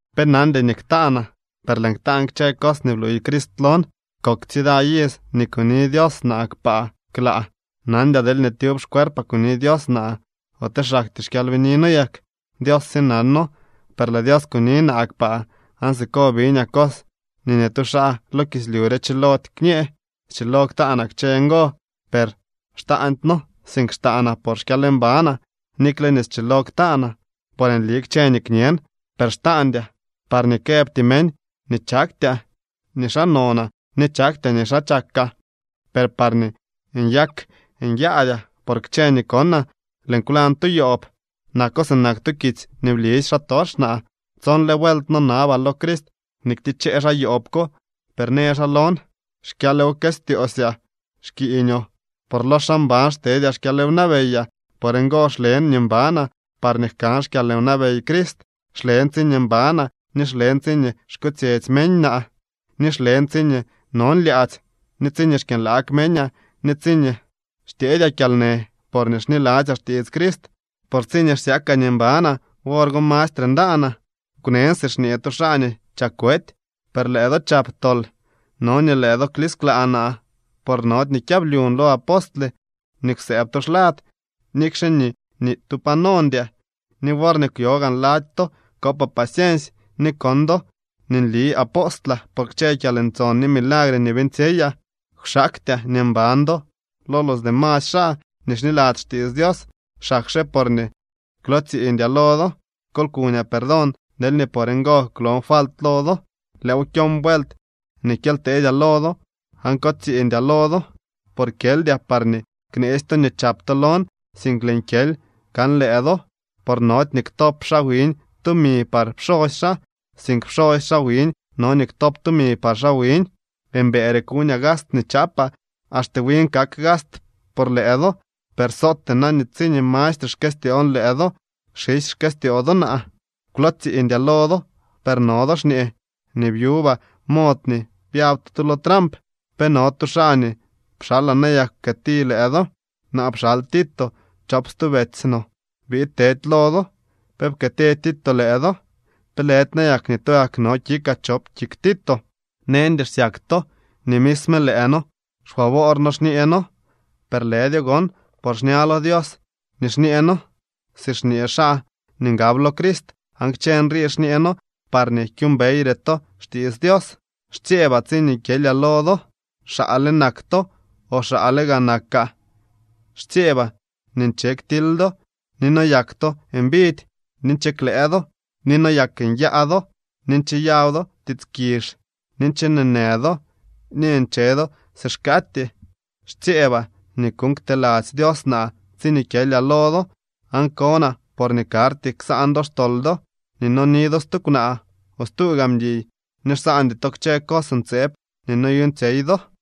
Pe nandy nii ktaanaa, per lëën ktaan kchë cos nii bluuy Crist lon. Kok tsida iz nii kuni Dios naa kpaa klaa. Nandyaa deelñee tyub xcuerpaa kuni Dios naa, ote xaktyee xkyalbinino yak. Dios sye nano. Per lëë Dios kuni naa kpaa, aan siko biñaa cos nii ni tu xaa lo kislyu re chilody kñee. Schilo ktaanaa kchë ngo, per xtaandyno, sink xtaanaa por xkyalmbanaa. Nikle nii schilo ktaanaa, por nli kchë nii kñen, per xtaandyaa, parñee këbty meñ nii chaktyaa nii xaa nonaa ni chaktyaa nii xaa chakaa. Per parñee nyak nyaadyaa por kchë nii konaa, lëën kwlañ tu yoob. Nako sinak tu kitsy nii blisy xaatox naa. Tsonle vuelt nonabaa lo Crist nii ktichee xaa yoob ko, per në xaa lon: “Xkyalwkëstyoosyaa xkiiñoo, por lo xaa mban xtedyaa xkyalwnabeyaa.” Por ngo xlen nii mbanaa, parñee jkan xkyalwnabey Crist. Xlen tsiñee mbanaa, ni xlen tsiñee xkotsyetsy meñaa, ni xlen tsiñee non lyaadzy, ni tsiñee xkyënlaag meñaa, ni tsiñee xtyeedyaa kyalnë porñee xniladzyaa xtiits Crist. Por tsiñee xsyakaa nii mbanaa, wor go mastre ndanaa. Kwnen si xñee tu xaa nii chak wety, per lëë do chap tol. No nii lëë do klisklaa naa, por nody nii kyablyun lo apostle nii kwsëëb to xlad, nikxe nii ni tu pa nondyaa. Ni worñee kwyo gaan lady to, kopaa paciensy. Ni kon do nii nli apostlaa por kchë kyalntson ni milagre nii beeñtsyeyaa. Kwxaaktyaa nii mban do lo los demasy xaa nii xniladzy xtiits Dios, xakxe porñee kwlootsiiñdyaa lo do. ¡Kol kuñaa perdón deelñee por ngo kwlon falt lo do! Lëëw kyon vuelt nii kyely tedyaa lo do. Aan ko tsiiñdyaa lo do. Por kyeldyaa parñee kneetsy to nii chap to lon, sink lëën kyely kan lëë do. Por nody nii ktop xaa wiñ tumi par pxosy xaa, sink pxosy xaa wiñ no nii ktop tumi par xaa wiñ. Mbëëre kuñaa gast nii chaapaa. Axte win kak gast por lëë do. Per sootee na nii tsiñee mastre xkëstyoon lëë do, xisy xkëstyoo do naa. Kwlootsiiñdyaa lo do, per no do xñee nii byubaa mod nii byab to tu lo tramp. ¿Pe no tu xaa nii pxalaa nayak pkëëti lëë do? Naa pxal Tito chop stu betsy no biid tedy lo do. ¿Pe pkëëti Tito lëë do? ¿Pe lëdy nayak nii tugak no kikaa chop kik Tito? Neñdy xsyak to nii misme lëë noo xfavoor noo xñee noo. Per lëdyo gon, por xña lo Dios nii xñee noo si xñee xaa nii ngab lo Crist. Aan kchë nrii xñee noo parñee kyuumbeyre to xtiits Dios. Xtsyeebaa tsiñee kyelyaa lo do, xaale nak to, o xaale gaa nakaa. Xtsyeebaa nii nche ktily do, ni noyak to mbidy, ni nche klëë do, ni noyak nyaa do, ni ncheyaw do tiits kizh, ni nche neenë do, ni ncheno do si xkaatyee. Xtsyeebaa nii kuuñ kteladzy Dios naa tsiñee kyelyaa lo do, aan konaa porñee karty ksaan do xtol do, ni noni do stu kwnaa o stu gaa mguiy, ni xsaandy to kchë cos ntseeb nii noyuuñtsyey do.